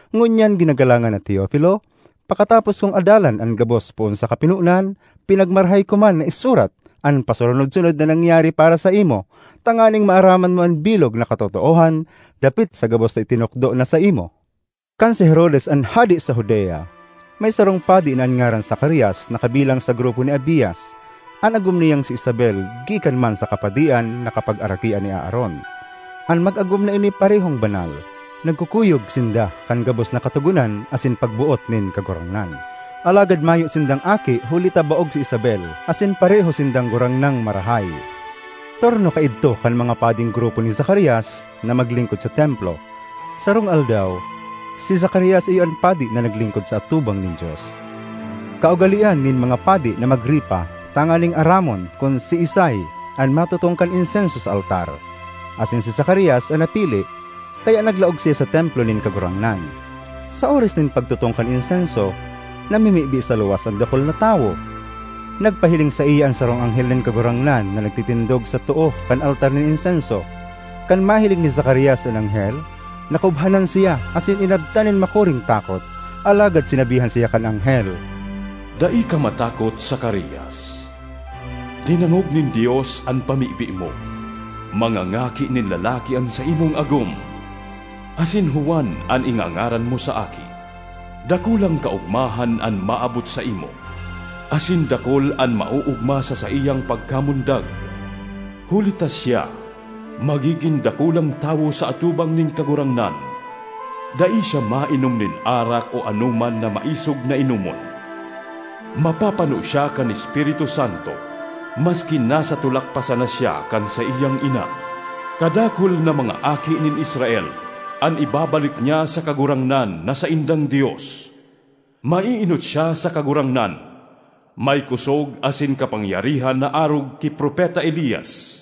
Ngunyan, ginagalangan na Teofilo, pakatapos kong adalan an gabos poon sa kapinonan, pinagmarahay ko man na isurat an pasurunod-sunod na nangyari para saimo, tanganing maaraman mo an bilog na katotoohan dapit sa gabos na itinukdo na saimo. Kan si Herodes an hade sa Judea, may sarong padi na an ngaran Zacarias na kabilang sa grupo ni Abias. An agom niyang si Isabel gikan man sa kapadian na kapagarakian ni Aaron. An mag-agom na ini parehong banal; nagkukuyog sinda kan gabos na katogonan asin pagboot nin Kagurangnan. Alagad mayo sindang aki huli ta baog si Isabel asin pareho sindang gurang nang marahay. Turno kaidto kan mga pading grupo ni Zacarias na maglingkod sa templo. Sarong aldaw, si Zacarias iyo an padi na naglingkod sa atubang nin Dios. Kaugalean nin mga padi na magripa tanganing aramon kun siisay an matutong kan insenso sa altar; asin si Zacarias an napili. Kaya naglaog siya sa templo nin Kagurangnan. Sa oras nin pagtutong kan insenso, namimibi sa luwas an dakul na tawo. Nagpahiling saiya an sarong anghel nin Kagurangnan na nagtitindog sa too kan altar nin insenso. Kan mahiling ni Zacarias an anghel, nakubhanan siya asin inabtan nin makuring takot. Alagad sinabihan siya kan anghel, “Dai ka matakot, Zacarias! Dinangog nin Dios an pamibi mo; mangangaki nin lalaki an saimong agom, asin Juan an ingangaran mo sa aki. Dakulang kaogmahan an maabot saimo, asin dakul an maoogma sa saiyang pagkamundag, huli ta siya magigin dakulang tawo sa atubang nin Kagurangnan. Dai siya mainom nin arak o anoman na maisog na inomon. Mapapano siya kan Espiritu Santo maski nasa tulak pa sana siya kan saiyang ina. Kadakul na mga aki nin Israel an ibabalik niya sa Kagurangnan na saindang Dios. Maeenot siya sa Kagurangnan, may kosog asin kapangyarihan na arog ki Propeta Elias,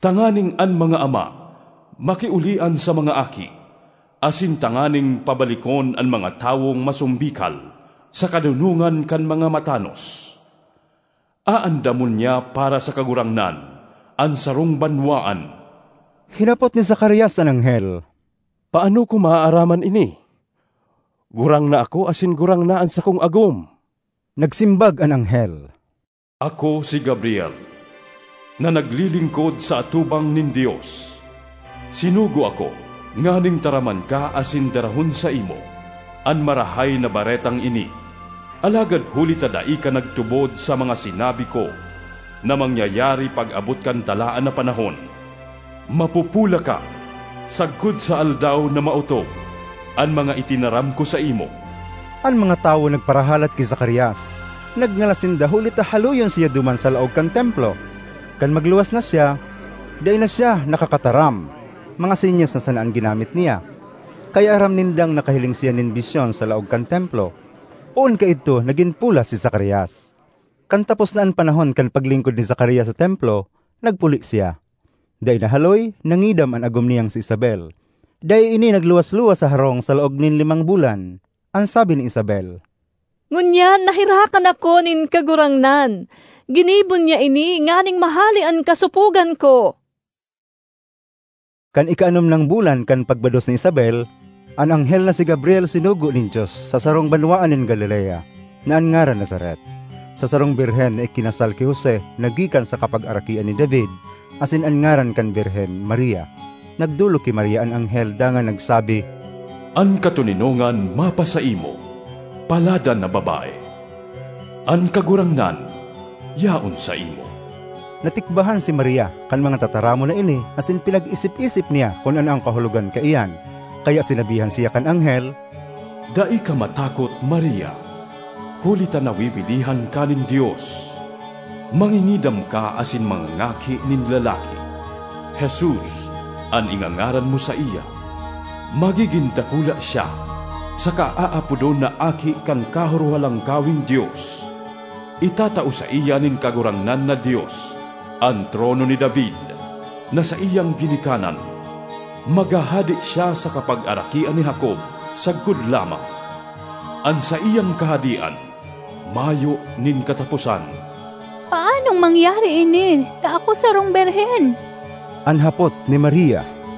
tanganing an mga ama makiolian sa mga aki, asin tanganing pabalikon an mga tawong masombikal sa kadonongan kan mga matanos. Aandamon niya para sa Kagurangnan an sarong banwaan.” Hinapot ni Zacarias an anghel, “Paano ko maaaraman ini? Gurang na ako asin gurang na an sakong agom?” Nagsimbag an anghel, “Ako si Gabriel na naglilingkod sa atubang nin Dios. Sinugo ako nganing taraman ka asin darahon saimo an marahay na baretang ini. Alagad huli ta dai ka nagtubod sa mga sinabi ko na mangyayari pag-abot kan talaan na panahon, mapopola ka sagkod sa aldaw na maotob an mga itinaram ko saimo.” An mga tawo nagparahalat ki Zacarias. Nagngalas sinda huli ta haloyon siya duman sa laog kan templo. Kan magluwas na siya, dai na siya nakakataram, mga senyas na sana an ginamit niya; kaya aram nindang nakahiling siya nin bisyon sa laog kan Templo. Poon kaidto, nagin pola si Zacarias. Kan tapos na an panahon kan paglingkod ni Zacarias sa Templo, nagpuli siya. Dai nahaloy nangidam an agom niyang si Isabel; dai ini nagluwas-luwas sa harong sa laog nin limang bulan. An sabi ni Isabel, “Ngunyan naherakan ako nin Kagurangnan; ginibo niya ini nganing mahale an kasopogan ko!” Kan ikaanom nang bulan kan pagbados ni Isabel, an anghel na si Gabriel sinugo nin Dios sa sarong banwaan nin Galilea, na an ngaran Nazaret, sa sarong birhen na ikinasal ki Jose na gikan sa kapagarakian ni David, asin an ngaran kan birhen Maria. Nagdolok ki Maria an anghel dangan nagsabi, “An katoninongan mapasaimo, paladan na babae! An Kagurangnan yaon saimo!” Natikbahan si Maria kan mga tataramon na ini asin pinag-isip-isip niya kun ano an kahulogan kaiyan. Kaya sinabihan siya kan anghel, “Dai ka matakot, Maria, huli ta nawiwilihan ka nin Dios. Mangingidam ka asin mangangaki nin lalaki; Jesus an ingangaran mo saiya. Magigin dakula siya saka aapodon na Aki kan Kahorohalangkaweng Dios. Itatao saiya nin Kagurangnan na Dios an trono ni David na saiyang ginikanan. Maghahade siya sa kapagarakian ni Jacob sagkod lamang; an saiyang kahadean mayo nin kataposan!” ”Paanong mangyari ini ta ako sarong birhen?” an hapot ni Maria.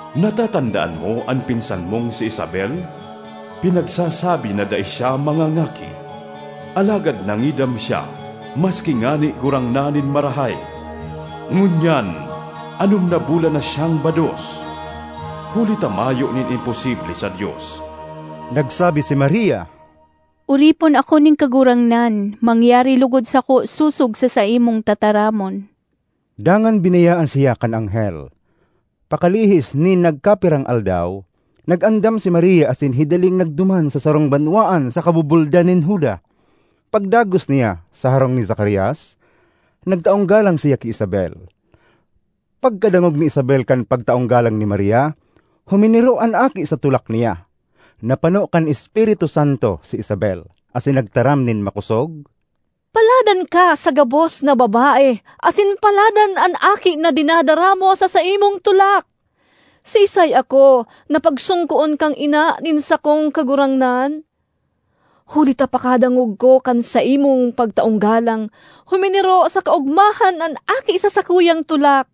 Natatandaan mo an pinsan mong si Isabel? Pinagsasabi na dai siya mangangaki, alagad nangidam siya maski ngani gurang na nin marahay. Ngunyan anom na bulan na siyang bados, huli ta mayo nin imposible sa Dios.” Nagsabi si Maria, “Oripon ako nin Kagurangnan; mangyari logod sako sosog sa saimong tataramon.” Dangan binayaan siya kan anghel. Pakalihis nin nagkapirang aldaw, nag-andam si Maria asin hidaling nagduman sa sarong banwaan sa kabubuldan nin Juda. Pagdagos niya sa harong ni Zacarias, nagtaong galang siya ki Isabel. Pagkadangog ni Isabel kan pagtaong galang ni Maria, huminiro an aki sa tulak niya. Napano kan Espiritu Santo si Isabel, asin nagtaram nin makosog, “Paladan ka sa gabos na babae asin paladan an aki na dinadara mo sa saimong tulak! Siisay ako na pagsongkoon kan ina nin sakong Kagurangnan? Huli ta pakadangog ko kan saimong pagtaong galang, huminiro sa kaogmahan an aki sa sakuyang tulak.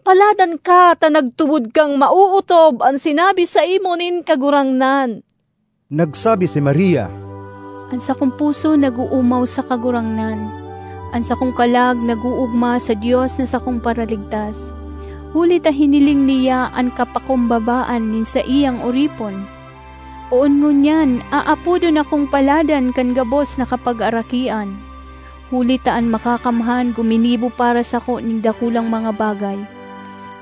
Paladan ka ta nagtubod kang maootob an sinabi saimo nin Kagurangnan!” Nagsabi si Maria, “An sakong puso nag-oomaw sa Kagurangnan; an sakong kalag nag-oogma sa Dios na sakong Paraligtas; huli ta hiniling niya an kapakumbabaan nin saiyang oripon! Poon ngunyan aapodon akong paladan kan gabos na kapagarakian, huli ta an Makakamhan guminibo para sako nin dakulang mga bagay;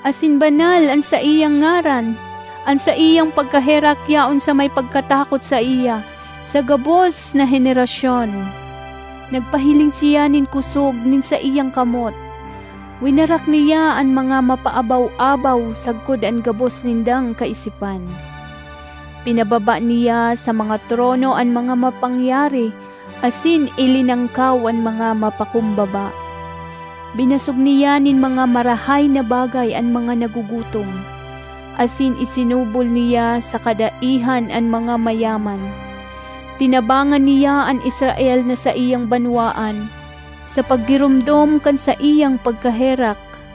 asin Banal an saiyang ngaran. An saiyang pagkaherak yaon sa may pagkatakot saiya, sa gabos na henerasyon. Nagpahiling siya nin kosog nin saiyang kamot, winarak niya an mga mapaabaw-abaw sagkod an gabos nindang kaisipan. Pinababa niya sa mga trono an mga mapangyari, asin ilinangkaw an mga mapakumbaba. Binasog niya nin mga marahay na bagay an mga nagugutom, asin isinubol niya sa kadaihan an mga mayaman. Tinabangan niya an Israel na saiyang banwaan, sa paggiromdom kan saiyang pagkaherak,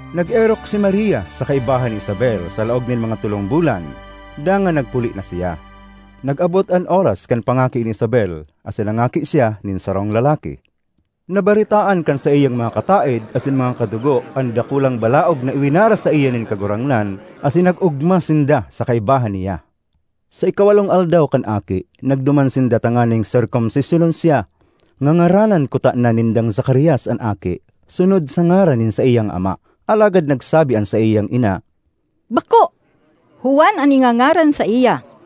Nag-erok si Maria sa kaibahan ni Isabel sa laog nin mga tolong bulan, dangan nagpuli na siya. Nag-abot an oras kan pangaki ni Isabel, asin nangaki siya nin sarong lalaki. Nabaretaan kan saiyang mga kataed asin mga kadugo an dakulang balaog na iwinaras saiya nin Kagurangnan asin nag-ogma sinda sa kaibahan niya. Sa ikawalong aldaw kan aki, nagduman sinda tanganing serkomsisyonon siya. Ngangaranan kutana nindang Zacarias an aki, sunod sa ngaran nin saiyang ama, alagad nagsabi an saiyang ina, “Bako! Juan an ingangaran saiya.”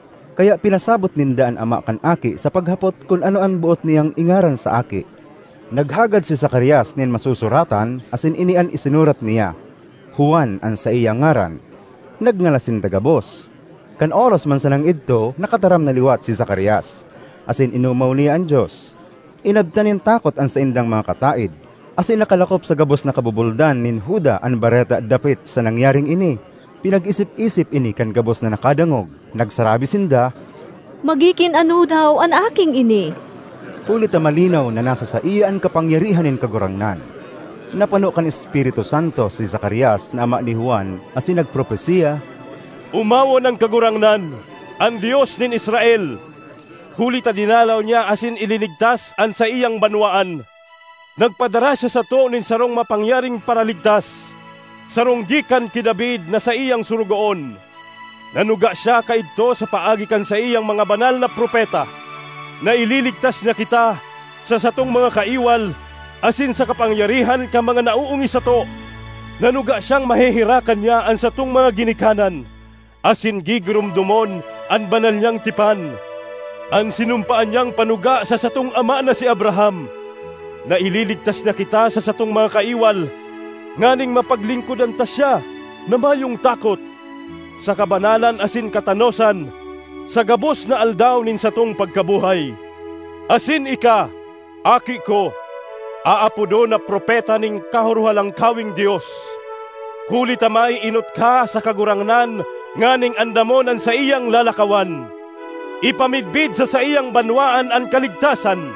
Kaya pinasabot ninda an ama kan aki sa paghapot kun ano an boot niyang ingaran sa aki. Naghagad si Zacarias nin masusuratan asin ini an isinurat niya, “Juan an saiyang ngaran.” Nagngalas sinda gabos! Kan oras man sanang idto nakataram na liwat si Zacarias; asin inomaw niya an Dios. Inabtan nin takot an saindang mga kataed, asin nakalakop sa gabos na kabubuldan nin Juda an bareta dapit sa nangyaring ini. Pinag-isip-isip ini kan gabos na nakadangog; nagsarabi sinda, “Magigin ano daw an aking ini?” Huli ta malinaw na nasa saiya an kapangyarihan nin Kagurangnan. Napano kan Espiritu Santo si Zacarias na ama ni Juan, asin nagpropesia, ”Omawon an Kagurangnan, an Dios nin Israel! Huli ta dinalaw niya asin ilinigtas an saiyang banwaan. Nagpadara siya sato nin sarong mapangyaring Paraligtas, sarong gikan ki David na saiyang sorogoon. Nanuga siya kaidto sa paagi kan saiyang mga banal na propeta na ililigtas niya kita sa satong mga kaiwal, asin sa kapangyarihan kan mga naoongis sato. Nanuga siyang maheherakan niya an satong mga ginikanan, asin gigiromdomon an banal niyang tipan. An sinumpaan niyang panuga sa satong ama na si Abraham, na ililigtas niya kita sa satong mga kaiwal, nganing mapaglingkodan ta siya na mayong takot, sa kabanalan asin katanosan, sa gabos na aldaw nin satong pagkabuhay. ”Asin ika, aki ko, aapodon na propeta nin Kahorohalangkaweng Dios; huli ta maeenot ka sa Kagurangnan nganing andamon an saiyang lalakawan, ipamidbid sa saiyang banwaan an kaligtasan,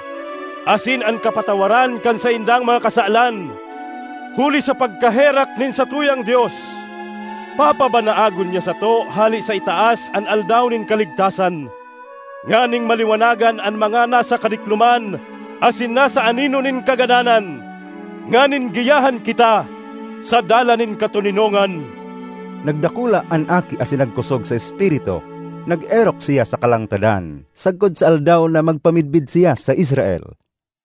asin an kapatawaran kan saindang mga kasalan. Huli sa pagkaherak nin satuyang Dios, papabanaagon niya sato hale sa itaas an aldaw nin kaligtasan, nganing maliwanagan an mga nasa kadikloman asin nasa anino nin kagadanan, nganing giyahan kita sa dalan nin katoninongan.” Nagdakula an aki asin nagkosog sa espiritu. Nag-erok siya sa kalangtadan sagkod sa aldaw na magpamidbid siya sa Israel.